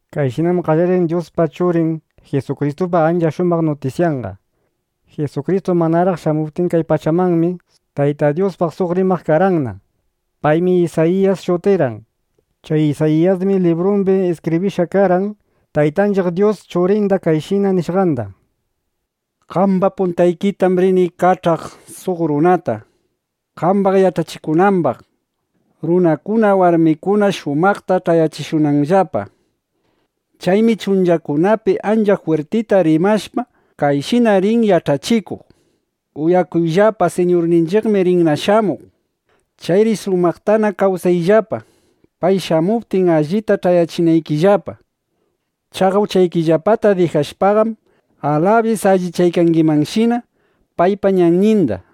Kayshinam qallarin Dyuspa Churin Jisukristupa ancha shumaq nutisyanqa. (Jisukristu manaraq shamuptin kay pachamanmi, Tayta Dyuspaq suq rimaq karqanna. Paymi Isayiyas shutirqan.) Chay Isayiyasmi librumbi iskibrishqa karqan Taytanchiq Dyus Churinda kayshina nishqanda: Qamba puntaykitam rini kach'aq suq runata, qambaq yach'achikunambaq, runakuna, warmikuna shumaqta ch'ayachishunanllapa. Chaymi chunchakunapi ancha jwirtita rimashpa, kayshina rin yach'achikuq: “Uyakuyllapa, Siñurninchiqmi rinna shamuq. Chayri shumaqtana kawsayllapa, pay shamuptin, allita ch'ayachinaykillapa. Chaqa uchaykillapata dijashpaqam, alabis allichaykangimanshina paypa ñanninda”, nishpa.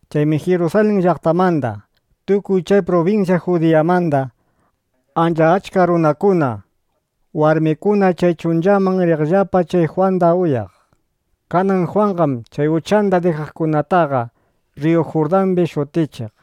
Chaymi Jirusalin llaqtamanda, tukuy chay prubinsyan Judiyamanda ancha achka runakuna, warmikuna chay chunchaman riqllapa, chay Jwanda uyaq. Kanan Jwanqam chay uchanda dijaqkunataqa rriyu Jurdambi shutichiq.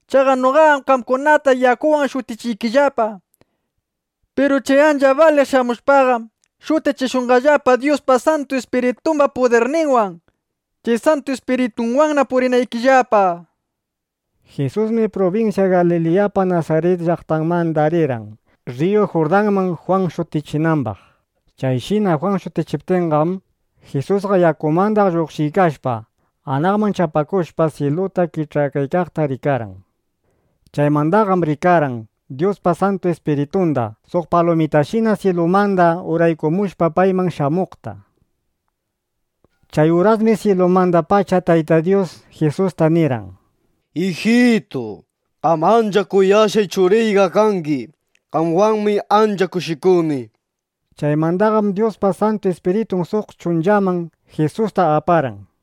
Chaqa noqaqam qamkunataqa yakuwan shutichiykillapa. Piru chay ancha baliq shamushpaqam, shutichishunqallapa Dyuspa Santu Ispiritumba pudirninwan, chay Santu Ispiritunwanna purinaykillapa. Jisusmi prubinsya Galiliyapa Nasarit llaqtanmanda rirqan Rriyu Jurdanman, Jwan shutichinambaq. Chayshina Jwan shutichiptinqam, Jisusqa yakumanda lluqshiykashpa, anaqman chapakushpa, syiluta kich'akaykaqta rikarqan. Chaymandaqam rikarqan Dyuspa Santu Ispiritunda suq palumitashina syilumanda urangumushpa payman shamuqta. Chay urasmi syilumandapacha Tayta Dyus Jisusta nirqan: —¡Ijitu! ¡Qam ancha kuyashqay Churiyqa kangi! ¡Qamwanmi ancha kushikuni! nishpa. Chaymandaqam Dyuspa Santu Ispiritun suq chunchaman Jisusta aparqan.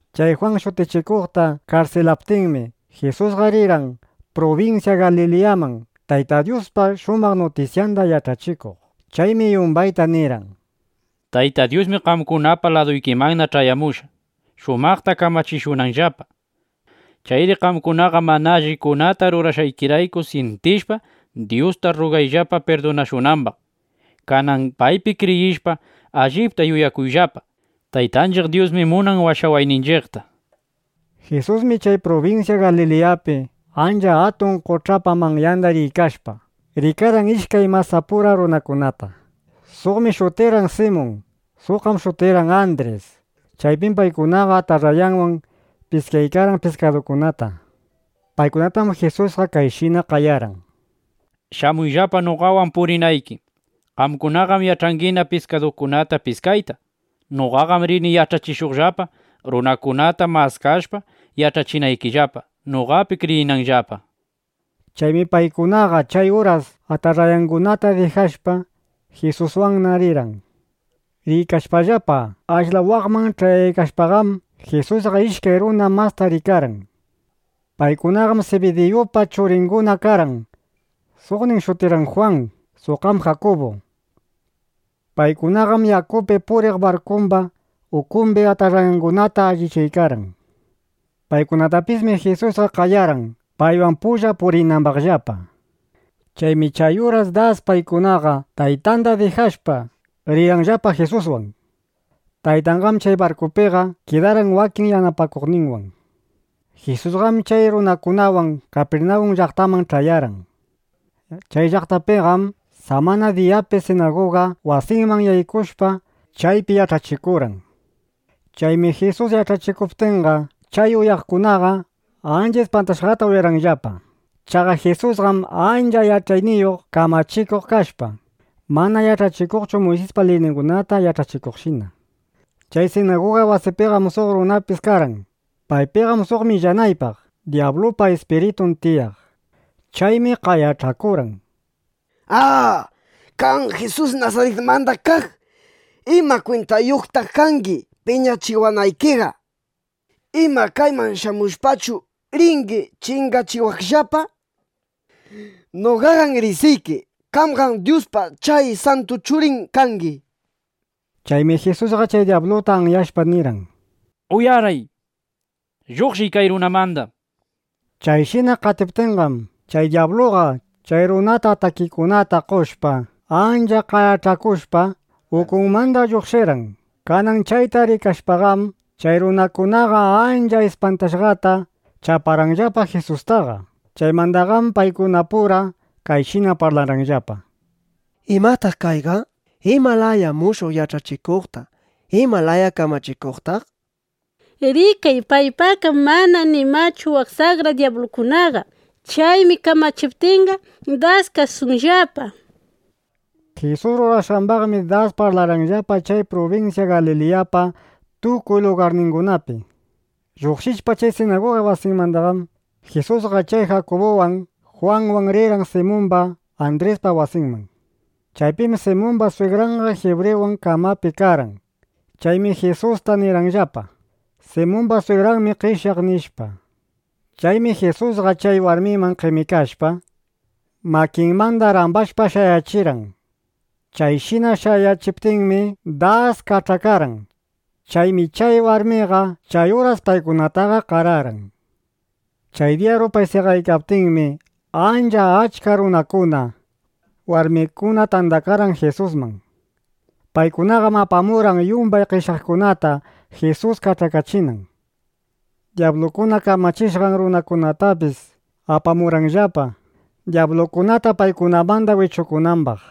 Chay Jwan Shutichikuqta karsilaptinmi, Jisusqa rirqan prubinsya Galiliyaman, Tayta Dyuspa shumaq nutisyanda yach'achikuq. Chaymi yumbayta nirqan: —Tayta Dyusmi qamkunapa laduykimanna ch'ayamushqa, shumaqta kamachishunanllapa. Chayri qamkunaqa mana allikunata rurashqaykirayku syintishpa, Dyusta rrugayllapa pirdunashunambaq. Kanan paypi kriyishpa, allipta yuyakuyllapa: Taytanchiq Dyusmi munan washawayninchiqta, nishpa. Jisusmi chay prubinsya Galiliyapi ancha atun qoch'apa manyanda riykashpa, rikarqan ishkay masapura runakunata. Suqmi shutirqan Simun. Suqqam shutirqan Andris. Chaypim paykunaqa atarrayanwan piskaykarqan piskadukunata. Paykunatam Jisusqa kayshina qayarqan: —Shamuyllapa noqawan purinayki. Qamkunaqam yach'angina piskadukunata piskayta. Noqaqam rini yach'achishuqllapa, runakunata maskashpa, yach'achinaykillapa, noqapi kriyinanllapa, nishpa. Chaymi paykunaqa chay uras atarrayangunata dijashpa, Jisuswanna rirqan. Riykashpallapa, ashla waqman ch'ayaykashpaqam, Jisusqa ishkay runa masta rikarqan. Paykunaqam Sibidiyupa churinguna karqan. Suqnin shutirqan Jwan; suqqam Jakubu. Paykunaqam yakupi puriq barkumba ukumbi atarrayangunata allichaykarqan. Paykunatapismi Jisus qayarqan, paywan pulla purinambaqllapa. Chaymi chay uras das paykunaqa taytanda dijashpa, rirqanllapa Jisuswan. Taytanqam chay barkupiqa kidarqan wakin yanapakuqninwan. Jisusqam chay runakunawan Kapirnawun llaqtaman ch'ayarqan. Chay llaqtapiqam samana diyapi sinaguga wasiman yaykushpa, chaypi yach'achikurqan. Chaymi Jisus yach'achikuptinqa, chay uyaqkunaqa ancha ispantashqata uyarqanllapa. Chaqa Jisusqam ancha yach'ayniyuq kamachikuq kashpa, mana yach'achikuqchu Muysispa liyningunata yach'achikuqshina. Chay sinaguga wasipiqam suq runapis karqan. Paypiqam suq millanaypaq dyablupa ispiritun tiyaq. Chaymi qayach'akurqan: —¡A! Qam Jisus Nasaritmanda kaq, ¿ima kwintayuqtaq kangi piñachiwanaykiqa? ¿Ima, kayman shamushpachu, ringi chingachiwaqllapa? ¡Noqaqam riqsiyki! ¡Qamqam Dyuspa chay santu Churin kangi! nishpa. Chaymi Jisusqa chay dyabluta anyashpa nirqan: —¡Uyaray! ¡Lluqshiy kay runamanda! nishpa. Chayshina qatiptinqam, chay dyabluqa chay runata atakikunata qoshpa, ancha qayach'akushpa, ukunmanda lluqshirqan. Kanan chayta rikashpaqam, chay runakunaqa ancha ispantashqata chaparqanllapa Jisustaqa. Chaymandaqam paykunapura kayshina parlarqanllapa: —¿Imataq kayqa? ¿Ima laya mushuq yach'achikuqtaq, ima laya kamachikuqtaq? ¡Rikay, paypaqqam mana nimachu waq saqra dyablukunaqa! ¡Chaymi kamachiptinqa, das kasunllapa! nishpa. Jisus rurashqambaqmi das parlarqanllapa chay prubinsya Galiliyapa tukuy lugarningunapi. Lluqshishpa chay sinaguga wasimandaqam, Jisusqa chay Jakubuwan, Jwanwan rirqan Simumba, Andrispa wasinman. Chaypim Simumba swigranqa jibriwan kamapi karqan. Chaymi Jisusta nirqanllapa: —Simumba swigranmi qeshyaq, nishpa. Chaymi Jisusqa chay warmiman qemikashpa, makinmanda rambashpa, shayachirqan. Chayshina shayachiptinmi, das kach'akarqan. Chaymi chay warmiqa chay uras paykunataqa qararqan. Chay diya rupay seqaykaptinmi, ancha achka runakuna, warmikuna tandakarqan Jisusman. Paykunaqam apamurqan yumbay qeshyaqningunata, Jisus kach'akachinan. Dyablukuna kamachishqan runakunatapis apamurqanllapa, dyablukunata paykunamanda wichukunambaq.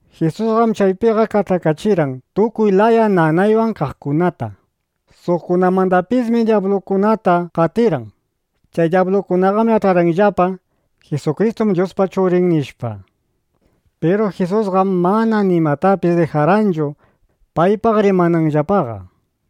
Jisusqam chaypiqa kach'akachirqan tukuy laya nanaywan kaqkunata. Suqkunamandapismi dyablukunata qatirqan. Chay dyablukunaqam yach'arqanllapa: Jisukristum Dyuspa Churin, nishpa. Piru Jisusqam mana nimatapis dijarqanchu, paypaq rimananllapaqa.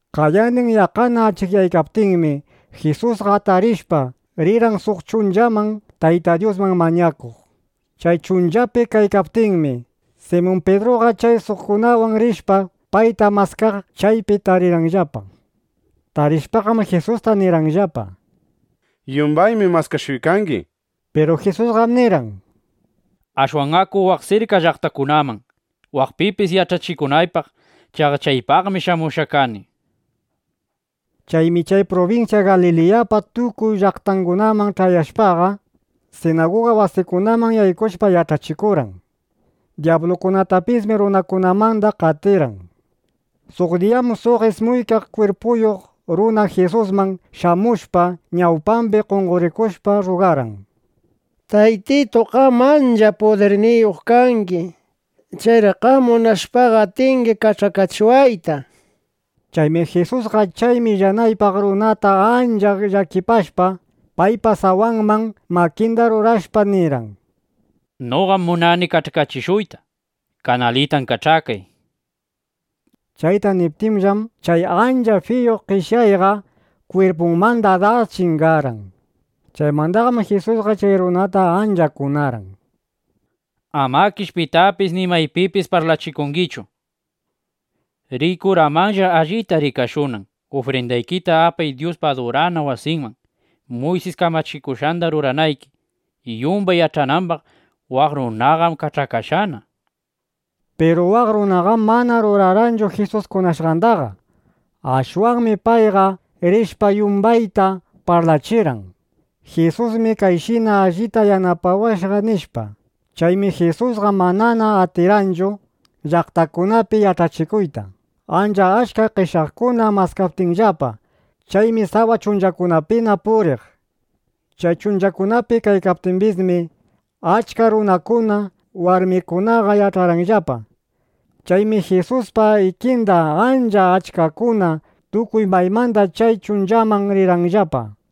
Qayandin yaqqana achikyaykaptinmi, Jisusqa atarishpa, rirqan suq chunchaman, Tayta Dyusman mañakuq. Chay chunchapi kaykaptinmi, Simun Pidruqa chay suqkunawan rishpa payta maskaq, chaypi tarirqanllapa. Tarishpaqam, Jisusta nirqanllapa: —Yumbaymi maskashuykangi, nishpa. Piru Jisusqam nirqan: —Ashwan aku waq sirka llaqtakunaman, waqpipis yach'achikunaypaq. Chaqa chaypaqmi shamushqaqa kani, nishpa. Chaymi chay prubinsya Galiliyapa tukuy llaqtangunaman ch'ayashpaqa, sinaguga wasikunaman yaykushpa, yach'achikurqan. Dyablukunatapismi runakunamanda qatirqan. Suq diyam suq ismuykaq kwirpuyuq runa Jisusman shamushpa, ñawpambi qonqorikushpa rrugarqan: —¡Taytitu! Qamqam ancha pudirniyuq kangi. Chayri qam munashpaqa, atingi kach'akachiwayta, nishpa. Chaymi Jisusqa chay millanaypaq runata ancha llakipashpa, paypa sawanman makinda rurashpa nirqan: —Noqam munani kach'akachishuyta. Kanalitan kach'akay, nishpa. Chayta niptinllam, chay ancha fiyu qeshyayqa kwirpunmanda das chingarqan. Chaymandaqam Jisusqa chay runata ancha kunarqan: —Amakish pitapis ni maypipis parlachikungichu. Riy kuramanlla, allita rikashunan. Ufrindaykita apay Dyuspa adurana wasinman, Muysis kamachikushqanda ruranayki, yumban yach'anambaq: Waq runaqam kach'akashqana, nishpa. Piru waq runaqam mana rurarqanchu Jisus kunashqandaqa. Ashwanmi payqa rishpa, yumbayta parlachirqan: —Jisusmi kayshina allita yanapawashqa, nishpa. Chaymi Jisusqa manana atirqanchu llaqtakunapi yach'achikuyta, ancha achka qeshyaqkuna maskaptinllapa. Chaymi sawa chunchakunapina puriq. Chay chunchakunapi kaykaptimbismi, achka runakuna, warmikunaqa yach'arqanllapa. Chaymi Jisuspa ikinda ancha achkakuna tukuy maymanda chay chunchaman rirqanllapa.